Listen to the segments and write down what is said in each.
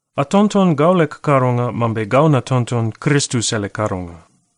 Atonton gau leg kadonga mambe gau natonton Kristus ele kadonga.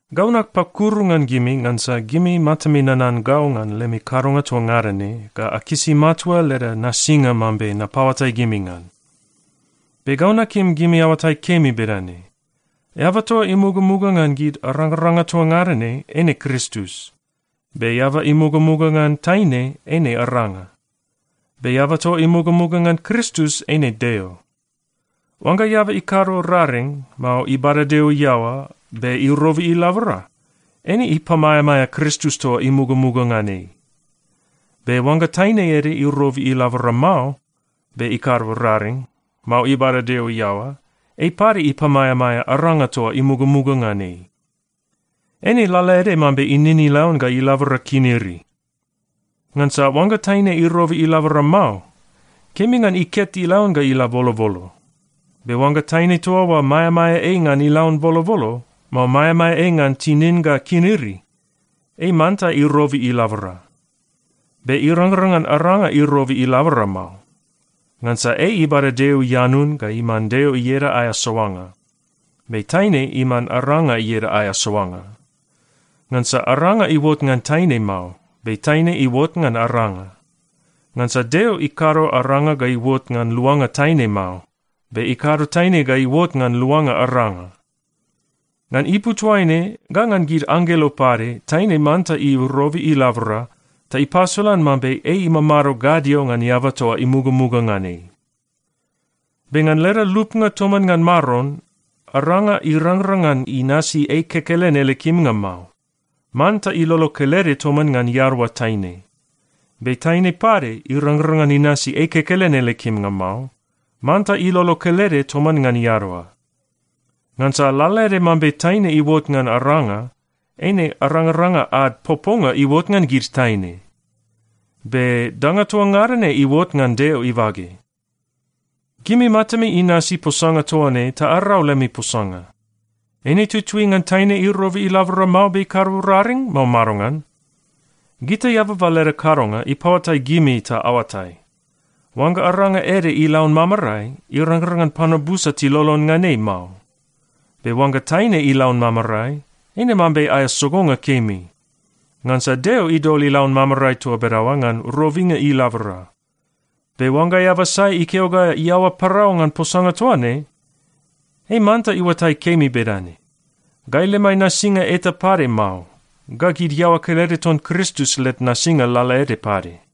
Gau napakuru ngan gimi ngansa gimi matami nanan gau ngan lemi kadonga toa ngada ne ga akisi matua leda nasinga mambe napaoatai gimi ngan. Be gau nakim gimi aoatai kemi bedane: Eaba toa imugamuga ngan gid arangaranga toa ngada ne eine Kristus. Be eaba imugamuga ngan taine, eine aranga. Be eaba toa imugamuga ngan Kristus eine Deo. Oangga eaba ikado raring, mao ibada Deo iaoa, be irobi ilabora, eine ipamaeamaea Kristus toa imugamuga ngan ei. Be oangga taine ede irobi ilabora mao, be ikado raring, mao ibada Deo iaoa, ei pade ipamaeamaea aranga toa imugamuga ngan ei. Eine lalaede mambe inin ilaun ga ilabora kiniri. Ngansa oangga taine irobi ilabora mao, kemi ngan iket ilaun ga ila bolobolo. Be oangga taine toa oa maeamaea ei ngan ilaun bolobolo, mao maeamaea ei ngan tinin ga kiniri, ei manta irobi ilabora. Be irangrang ngan aranga irobi ilabora mao, ngansa ei ibada Deo ianun ga iman Deo ieda aea soanga. Be taine iman aranga ieda aea soanga. Ngansa aranga iuot ngan taine mao, be taine iuot ngan aranga. Ngansa Deo ikado aranga ga iuot ngan luanga taine mao, be ikado taine ga iuot ngan luanga aranga. Ngan ipu toaine ga ngan gid anggelo pade, taine manta irobi ilabora ta ipasolan mambe ei imamado gadio ngan eaba toa imugamuga ngan ei. Be ngan leda lupnga toman ngan Maron, aranga irangrang ngan inasi ei kekelen ele kimnga mao. Manta ilolo kelede toman ngan iadaoa taine. Be taine pade irangrang ngan inasi ei kekelen ele kimnga mao. Manta ilolo kelede toman ngan iadaoa. Ngansa lalaede mambe taine iuot ngan aranga, eine arangaranga ad poponga iuot ngan gid taine. Be danga toa ngada ne iuot ngan Deo ibage. Gimi matami inasi posanga toa ne ta arau lemi posanga. Eine tutui ngan taine irobi ilabora mao, be ikado raring, mao madongan? Gita eababa leda kadonga ipaoatai gimi ta aoatai: Oangga aranga ede ilaun mamarae, irangrang ngan panua busa tilolon ngan ei mao. Be oangga taine ilaun mamarae, eine mambe aea sogonga kemi. Ngansa Deo idol ilaun mamarae toa bedaoa ngan robinga ilabora. Be oangga eaba sai ikeo ga iaoa parau ngan posanga toa ne, ei manta iuatai kemi bedane: Gai lemai nasinga eta pade mao, ga gid iaoa kelede ton Kristus led nasinga lalaede pade.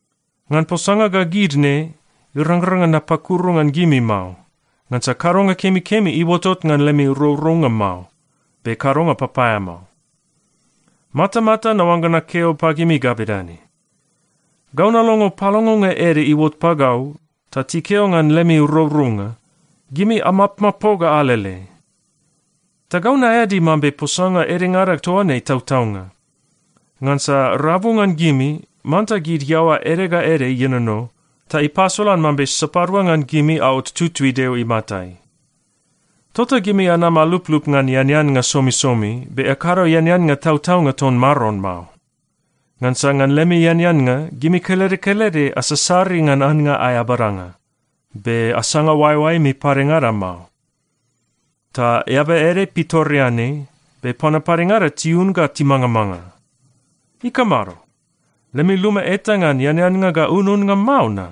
Ngan posanga ga gid ne, irangrang ngan napakuru ngan gimi mao. Ngansa kadonga kemikemi iuotot ngan lemi rourounga mao, be kadonga papaeamao. Matamata naoangga nakeo pagimi ga bedane: Gau nalongo palongonga ede iuot pagau, ta tikeo ngan lemi rourounga, gimi amapmapoga alele. Ta gau naeadi mambe posanga edengada toa ne tautaunga. Ngansa rabu ngan gimi, manta gid iaoa ede ga ede ienono, ta ipasolan mambe sapadua ngan gimi aot tutui Deo imatai. Tota gimi anam aluplup ngan eaneannga somisomi, be akado eaneannga tautaunga ton Maron mao. Ngansa ngan lemi eaneannga, gimi kelede kelede asasari ngan annga aea badanga, be asanga oaeoaemi padengada mao. Ta eaba ede pitoreanei, be panua padengada tiun ga timangamanga. Ikamado? Lemi luma eta ngan eaneannga ga ununnga mao na?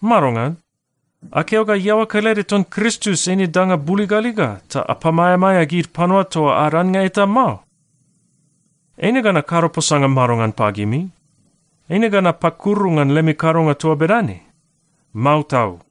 Madongan? Akeo ga iaoa kelede ton Kristus eine danga buligaliga, ta apamaeamaea gid panua toa ad annga eta mao? Eine ga nakado posanga madongan pagimi? Eine ga napakuru ngan lemi kadonga toa bedane? Mao tau!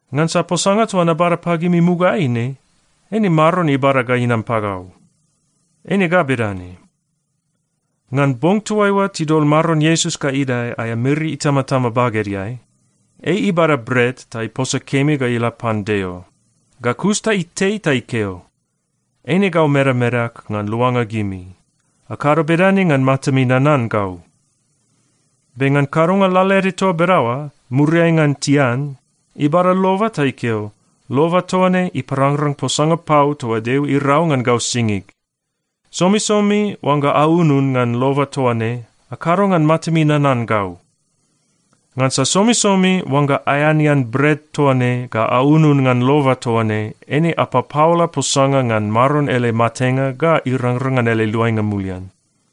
Ngansa posanga toa nabada pagimi mugaeai ne, eine Maron ibada ga inam pagau. Eine ga bedane: Ngan bong toaiua tidol Maron Iesus ga idae aea miri itamatama bagedeai, ei ibada bret ta iposa kemi ga ila pan Deo. Ga kus ta itei ta ikeo, “Eine gau medamedag ngan luanga gimi. Akado bedane ngan matami nanan gau.” Be ngan kadonga lalaede toa bedaoa, muriai ngan tian, ibada loba ta ikeo, “Loba toa ne iparangrang posanga pau toa Deo irau ngan gau singig. Somisomi oangga aunun ngan loba toa ne, akado ngan matami nanan gau.” Ngansa somisomi oangga aeanean bret toa ne ga aunun ngan loba toa ne, eine apapaola posanga ngan Maron ele matenga ga irangrang ngan ele luainga mulian.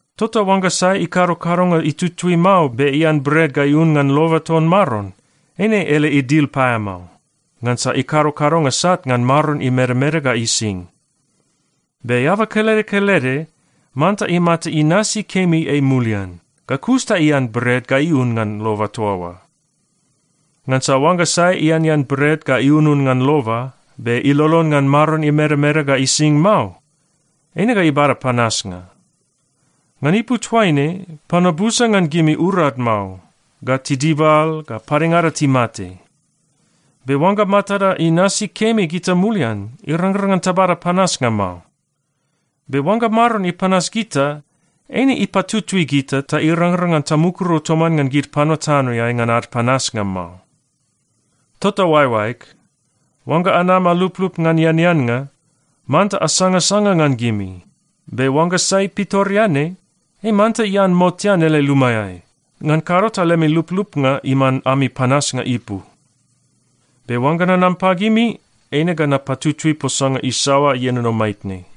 Tota oangga sai ikado kadonga itutui mao, be ian bret ga iun ngan loba ton Maron, eine ele idil paeamao, ngansa ikado kadonga sat ngan Maron imedameda ga ising. Be eaba kelede kelede manta imata inasi kemi ei mulian, ga kus ta ian bret ga iun ngan loba toa oa. Ngansa oangga sai ianean bret ga iunun ngan loba, be ilolon ngan Maron imedameda ga ising mao, eine ga ibada panasnga. Ngan ipu toaine, panua busa ngan gimi urad mao, ga tidibal, ga padengada timate. Be oangga matada inasi kemi gita mulian, irangrang ngan tabada panasnga mao. Be oangga Maron ipanas gita, eine ipatutui gita ta irangrang ngan tamukuru toman ngan gid panua tanoeai ngan ad panasnga mao. Tota oaeoaeg, oangga anam aluplup ngan eaneannga, manta asangasanga ngan gimi. Be oangga sai pitoreanei, ei manta ian motean ele lumaeai. Ngan kado ta lemi luplupnga iman ami panasnga ipu. Be oangga nanam pagimi, eine ga napatutui posanga isaoa ienono maitne.